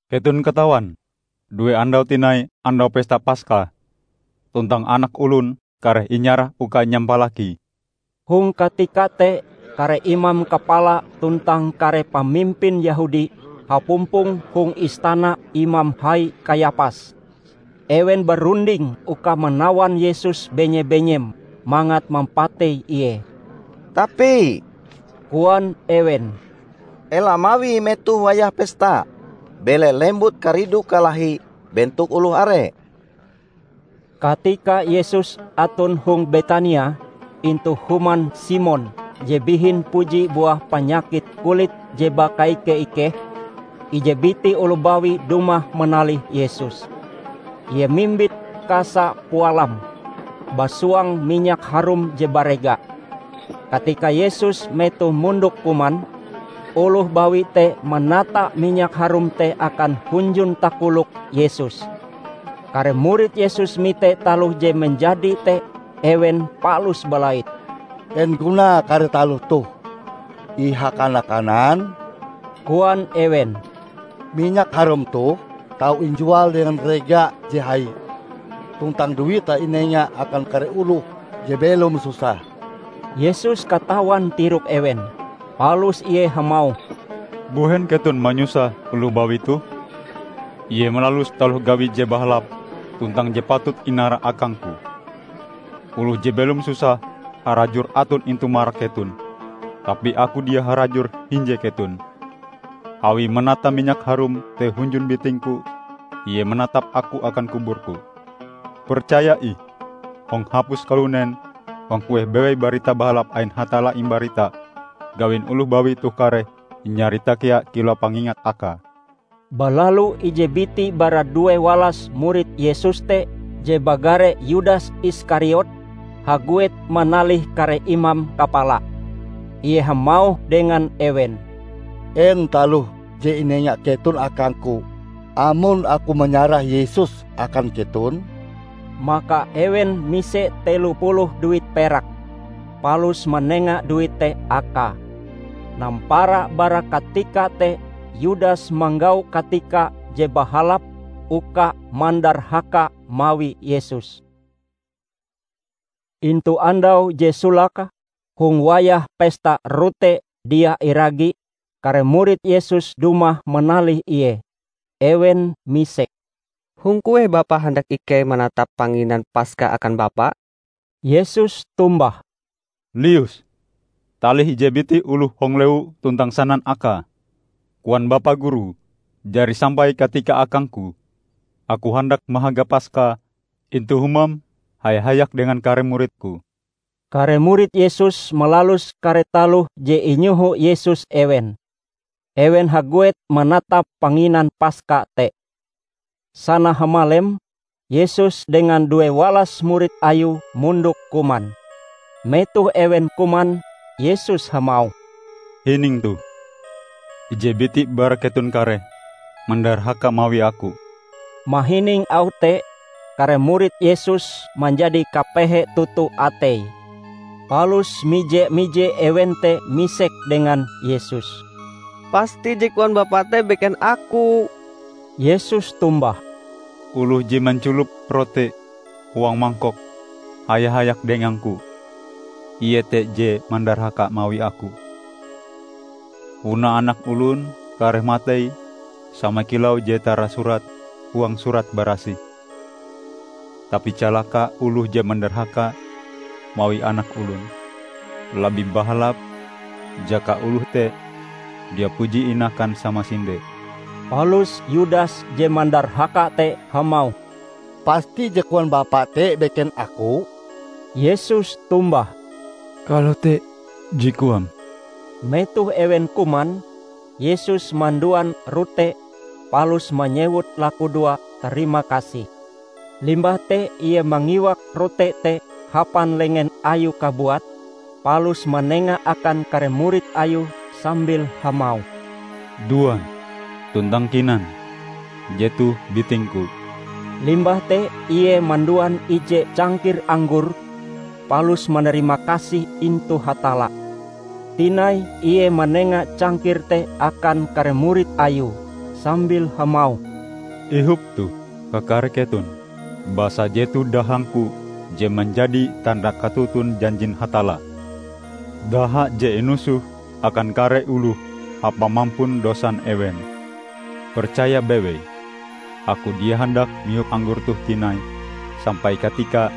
"Keton katawan due andau tinai Andau Pesta Paska, tuntang Anak Olon kareh inyarah uka inyampalaki!" Hong katika te kare imam kapala tuntang kare pamimpin Yehudi hapumpong hong istana Imam Hai Kayapas. Ewen barunding uka manawan Yesus benye-benyem mangat mampatei Ie. "Tapi," koan ewen, "ela mawie metoh wayah pesta bele lembut karidu kalahi bentok oloh are." Katika Yesus aton hong Betania, intu human Simon je bihin puji buah panyakit kulit je bakaike-ikeh, ije biti oloh bawi dumah manalih Yesus. Ie mimbit kasa pualam, basuang minyak harum je barega. Katika Yesus metoh mondok kuman, oloh bawi te manata minyak harum te akan hunjun takolok Yesus. Kare murid Yesus mite taloh je manjadi te ewen palus balait. "En gunae kare taloh toh ihakana-kanan?" koan ewen. "Minyak harum toh tau injual dengan rega je hai, tuntang duite inenga akan kare oloh je belom susah!" Yesus katawan tirok ewen, palus Ie hamauh, "Mbuhen keton manyusah oloh bawi toh? Ie malalus taloh gawi je bahalap tuntang je patut inara akang-Ku. Oloh je belom susah harajur aton intu marak keton, tapi Aku dia harajur hinje keton. Awie manata minyak harum te hunjun biting-Ku, ie manatap Aku akan kubur-Ku. Percaya ih! Hong hapus kalunen, hong kueh bewei Barita Bahalap ain Hatalla imbarita, gawin oloh bawi toh kareh inyarita kea kilau pangingat akae." Balalu ije biti bara due walas murid Yesus te, je bagare Yudas Iskariot, haguet manalih kare imam kapala. Ie hamauh dengan ewen, "En taloh je inenga keton akangku amon aku manyarah Yesus akan keton?" Maka ewen mise telo puluh duit perak, palus manenga duit te akae. Nampara bara katika te Yudas manggau katika je bahalap uka mandarhaka mawi Yesus. Intu andau je solake hong wayah Pesta Rote Dia Iragi, kare murid Yesus dumah manalih Ie. Ewen misek, "Hong kueh Bapa handak ikei manatap panginan Paska akan Bapa?" Yesus tombah, "Lius talih ije biti oloh hong lewu tuntang sanan akae, 'Koan Bapa Guru, jari sampai katika akang-Ku; Aku handak mahaga Paska intu humam haya-hayak dengan kare murid-Ku.' " Kare murid Yesus malalus kare taloh je inyoho Yesus ewen. Ewen haguet manatap panginan Paska te. Sana hamalem, Yesus dengan duewalas murid Ayue mondok kuman. Metoh ewen kuman, Yesus hamauh, "Hining toh: ije biti bara keton kareh mandarhaka mawi Aku." Mahining auh te, kare murid Yesus manjadi kapehe toto ateie. Palus mije-mije ewen te misek dengan Yesus, "Pasti je koan Bapa te beken aku?" Yesus tombah, "Oloh je manculop rote huang mangkok haya-hayak dengang-Ku, ie te je mandarhaka mawi Aku. Punae Anak Olon kareh matei sama kilau je tarasurat huang Surat Barasih. Tapi calaka oloh je mandarhaka mawi Anak Olon! Labih bahalap jaka oloh te dia puji inakan samasinde!" Palus Yudas je mandarhaka te hamauh, "Pasti je koan Bapa te beken aku?" Yesus tombah, "Kalote je koam!" Metoh ewen kuman, Yesus manduan rote palus manyewut lakudoa tarimakasih. Limbah te Ie mangiwak rote te hapan lengen Ayue kabuat palus manenga akan kare murid Ayue sambil hamauh, "Duan, tuntang kinan; jetoh biting-Ku." Limbah te Ie manduan ije cangkir anggor palus manarimakasih intu Hatalla. Tinai Ie manenga cangkir te akan kare murid Ayue, sambil hamauh, "Ihop toh, kakare keton. Basa jetoh dahang-Ku je manjadi tanda katoton janjin Hatalla -- daha je inusoh akan kare oloh hapa mampun dosan ewen. Percaya bewei, Aku dia handak mihop anggor toh tinai sampai katika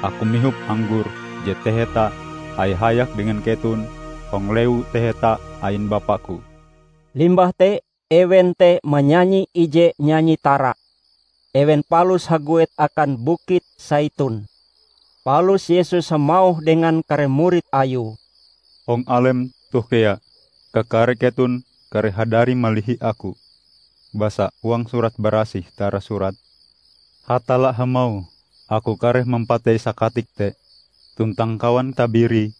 Aku mihop anggor je taheta haya-hayak dengan keton hong Lewu Taheta ain Bapa-Ku." Limbah te ewen te manyanyi ije nyanyi tara, ewen palus haguet akan Bukit Saitun. Palus Yesus hamauh dengan kare murid Ayue, "Hong alem toh kea kakare keton kareh hadari malihi Aku; basa huang Surat Barasih tarasurat: Hatalla hamauh, 'Aku kareh mampatei sakatik te, tuntang kawan tabirie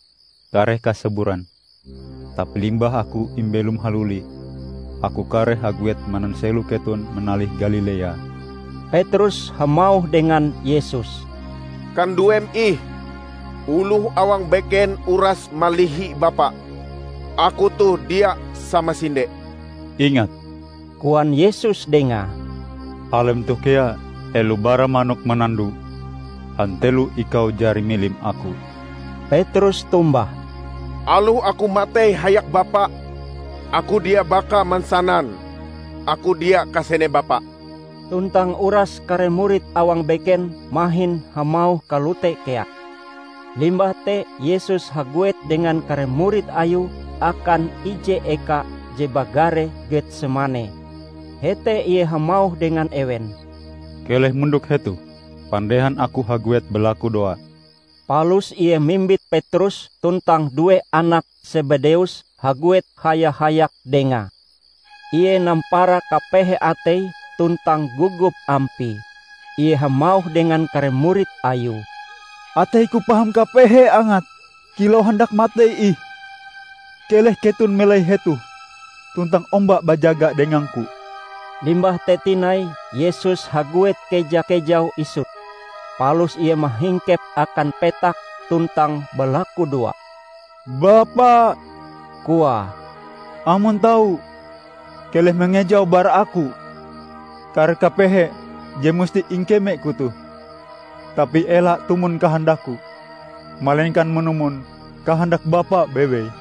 kareh kasaburan.' Tapi limbah Aku imbelom haluli, Aku kareh haguet mananselo keton manalih Galilea." Petrus hamauh dengan Yesus, "Kanduem ih oloh awang beken uras malihi Bapa, aku toh dia samasinde!" "Ingat," koan Yesus dengae, "Alem toh kea, helo bara manok manando, hantelo ikau jari milim Aku." Petrus tombah, "Aloh aku matei hayak Bapa, aku dia baka mansanan aku dia kasene Bapa!" Tuntang uras kare murid awang beken mahin hamauh kalote kea. Limbah te Yesus haguet dengan kare murid Ayue akan ije eka je bagare Getsemane. Hete Ie hamauh dengan ewen, "Keleh mondok hetoh pandehan Aku haguet balakudoa." Palus Ie mimbit Petrus tuntang due anak Sebedeus haguet haya-hayak Dengae. Ie nampara kapehe Ateie tuntang gogop Ampie. Ie hamauh dengan kare murid Ayue, "Atei-Ku paham kapehe angate kilau handak matei ih. Keleh keton melai hetoh, tuntang omba bajaga dengang-Ku." Limbah te tinai Yesus haguet keja-kejau isut, palus Ie mahingkep akan petak tuntang balakudoa. "Bapa," koae, "amon tau, keleh mangejau bara Aku kare kapehe je musti ingkeme-Ku toh. Tapi ela tumon kahandak-Ku, malengkan manumon kahandak Bapa bewei."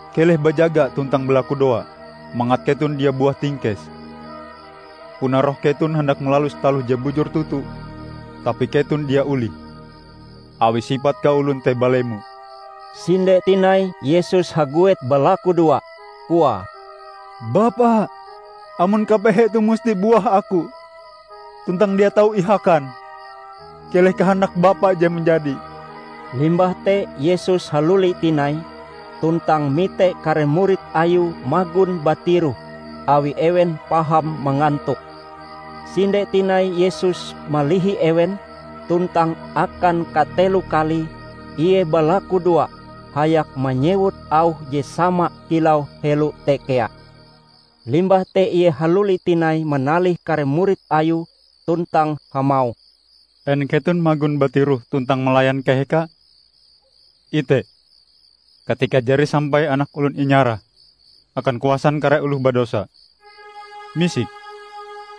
Keleh bajaga tuntang balakudoa mangat keton dia buah tingkes. Puna roh keton handak malalus taloh je bujur toto tapi keton dia olih, awi sipat kaolon te balemo." Sinde tinai Yesus haguet balakudoa, koae, "Bapa, amon kapehe toh musti buah Aku, tuntang dia tau ihakan, keleh kahandak Bapa je manjadi." Limbah te Yesus haluli tinai, tuntang mite kare murid Ayue magon batiroh awi ewen paham mangantok. Sinde tinai Yesus malihi ewen tuntang akan katelo kalie Ie balakudoa hayak manyewut auh je sama kilau helo te kea. Limbah te Ie haluli tinai manalih kare murid Ayue tuntang hamauh, "En keton magon batiroh tuntang malayan kaheka? Ite, katika jari sampai Anak Olon inyarah akan kuasan kare oloh badosa. Misik,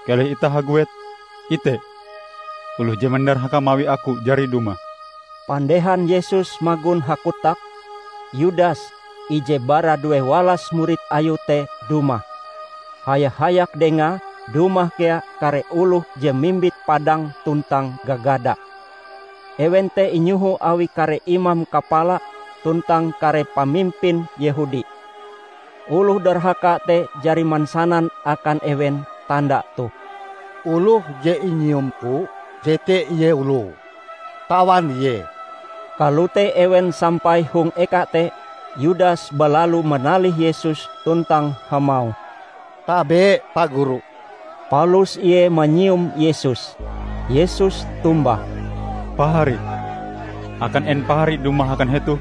keleh itah haguet. Ite! Oloh je mandarhaka mawi Aku jari dumah!" Pandehan Yesus magon hakotak, Yudas, ije bara duewalas murid Ayue te dumah. Haya-hayak dengae dumah kea kare oloh je mimbit padang tuntang gagada. Ewen te inyoho awi kare imam kapala tuntang kare pamimpin Yehudi. Oloh darhaka te jari mansanan akan ewen tanda toh, "Oloh je inyiumku, jete Ie oloe. Tawan Ie!" Kalote ewen sampai hong eka te, Yudas balalu manalih Yesus tuntang hamauh, "Tabe, Pa Guru!" Palus Ie manyium Yesus. Yesus tombah, "Pahari, akan en pahari dumah akan hetoh?"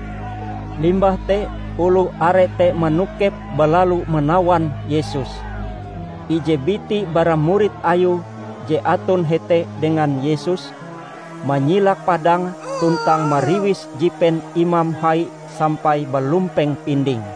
Limbah te oloh are te manokep balalu manawan Yesus. Ije biti bara murid Ayue je aton hete dengan Yesus, manyilak padange tuntang mariwis jipen imam hai sampai balumpeng pindinge.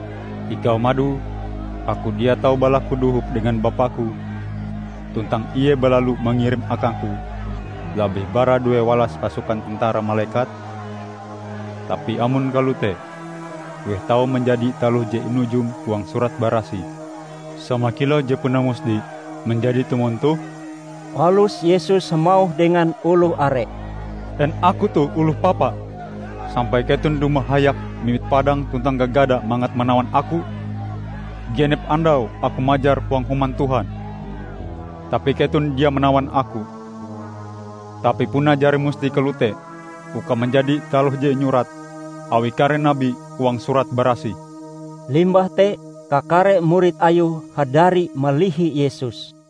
Ikau madoe, Aku dia tau balaku dohop dengan Bapa-Ku, tuntang Ie balalu mangirim akang-Ku labih bara duewalas pasukan tentara malekat? Tapi amon kalote, kueh tau manjadi taloh je inujum huang Surat Barasih sama kilau je puna musti manjadi tumon toh?" Palus Yesus hamauh dengan oloh are, "En Aku toh oloh papa, sampai keton dumah hayak mimbit padang tuntang gagada mangat manawan Aku? Genep andau Aku majar huang Human Tuhan tapi keton dia manawan Aku! Tapi puna jari musti kalote uka manjadi taloh je inyurat awi kare nabi huang Surat Barasih." Limbah te, kakare murid Ayue hadari malihi Yesus.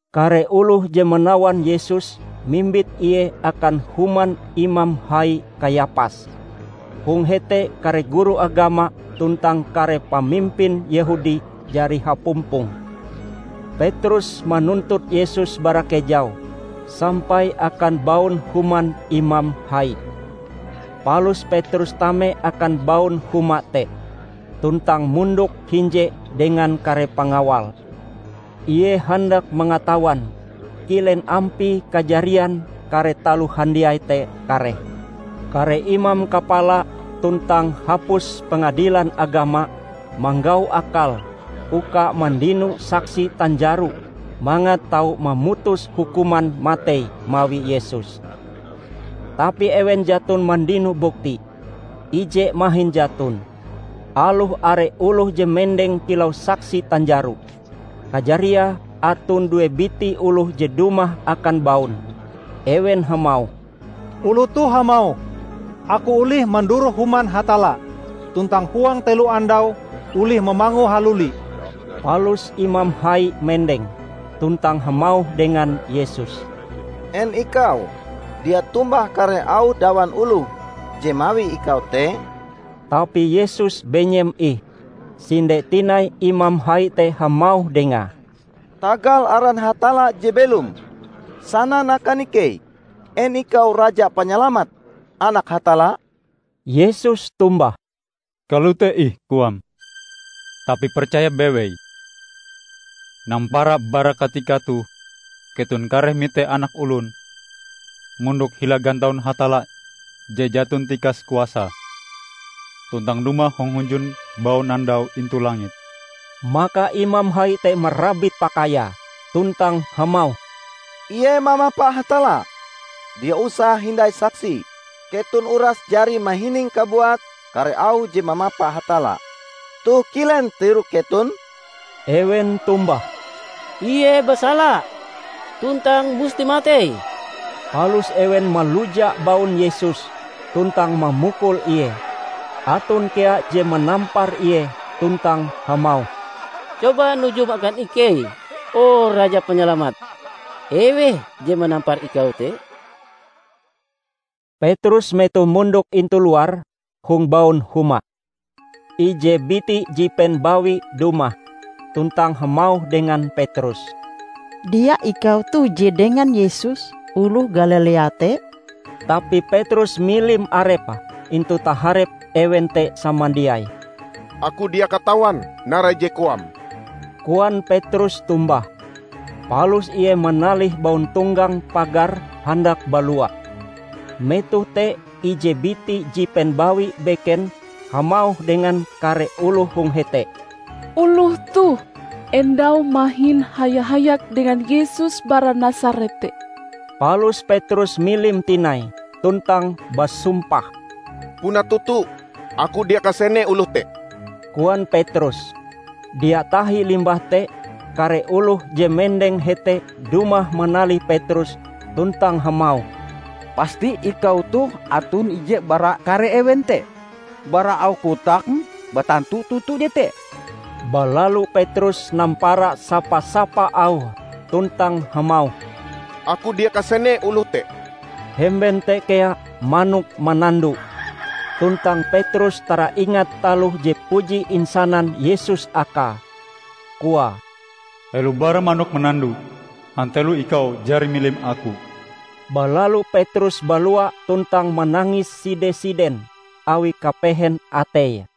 Kare oloh je manawan Yesus mimbit Ie akan human Imam Hai Kayapas. Hong hete kare guru agama tuntang kare pamimpin Yehudi jari hapumpong. Petrus manuntut Yesus bara kejau sampai akan baun human imam hai. Palus Petrus tame akan baun huma te, tuntang mondok hinje dengan kare pengawal. Ie handak mangatawan kilen ampie kajarian kare taloh handiai te kareh. Kare imam kapala tuntang hapus Pengadilan Agama manggau akal uka mandino saksi tanjaro mangat tau mamutus hukuman matei mawi Yesus. Tapi ewen jaton mandino bukti, ije mahin jaton, aloh are oloh je mendeng kilau saksi tanjaro. Kajariae aton due biti oloh je dumah akan baun. Ewen hamauh, "Oloh toh hamauh, 'Aku olih manduroh Human Hatalla, tuntang huang telo andau olih mamangue haluli.' " Palus imam hai mendeng, tuntang hamauh dengan Yesus, "En ikau dia tombah kare auh dawan oloh je mawi ikau te?" Tapi Yesus benyem ih. Sinde tinai imam hai te hamauh Dengae, "Tagal aran Hatalla je belom, sanan akan ikei en ikau Raja Panyalamat, Anak Hatalla?" Yesus tombah, "Kalote ih koam. Tapi percaya bewei: nampara bara katika toh, keton kareh mite Anak Olon mondok hila gantaun Hatalla Je Jaton Tikas Kuasae, tuntang dumah hong hunjun baunandau intu langit!" Maka imam hai te marabit pakaiae, tuntang hamauh, "Ie mamapa Hatalla! Dia usah hindai saksi. Keton uras jari mahining kabuat kare auh je mamapa Hatalla. Toh kilen tirok keton?" Ewen tombah, "Ie basala, tuntang musti matei." Palus ewen maluja baun Yesus, tuntang mamukul Ie. Aton kea je manampar Ie tuntang hamauh, "Coba nujum akan ikei, o Raja Panyalamat! Eweh je manampar ikau te?" Petrus metoh mondok intu luar, hong baun huma. Ije biti jipen bawi dumah, tuntang hamauh dengan Petrus, "Dia ikau toh je dengan Yesus oloh Galilea te?" Tapi Petrus milim arepe intu taharep ewen te samandiai. "Aku dia katawan narai je koam," koan Petrus tombah, palus ie manalih bauntonggang pagar handak balua. Metoh te ije biti jipen bawi beken hamauh dengan kare oloh hong hete, "Oloh toh endau mahin haya-hayak dengan Yesus bara Nasaret te." Palus Petrus milim tinai, tuntang basumpah. "Puna toto aku dia kasene oloh te!" koan Petrus. Dia tahi limbah te, kare oloh je mendeng hete dumah manalih Petrus tuntang hamauh, "Pasti ikau toh aton ije bara kare ewen te. Bara auh kotakm batantu toto jete." Balalu Petrus nampara sapa-sapa auhe tuntang hamauh, "Aku dia kasene oloh te!" Hemben te kea manok manando. Tuntang Petrus taraingat taloh je puji insanan Yesus akae, koae, "Helo bara manok manando, hantelo ikau jari milim Aku." Balalu Petrus balua tuntang manangis side-siden awi kapehen ateie.